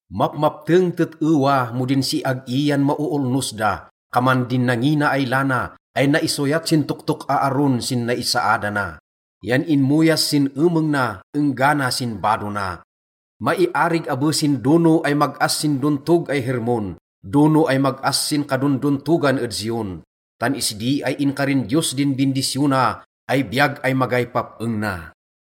Mapmapteng tet-ewa mo din siag-i yan maoolnos da! Kaman din nangina ay lana ay naisoyat sin toktok Aaron sin naisaadana yan inmoyas sin emeng na enggana sin bado na. Maiarig abe sin dono ay mag-as sin dontog ay Hermon, dono ay mag-as sin kadondontogan ed Zion. Tan isdi ay inkarin Diyos din bindisyona ay biyag ay magay pap-eng na.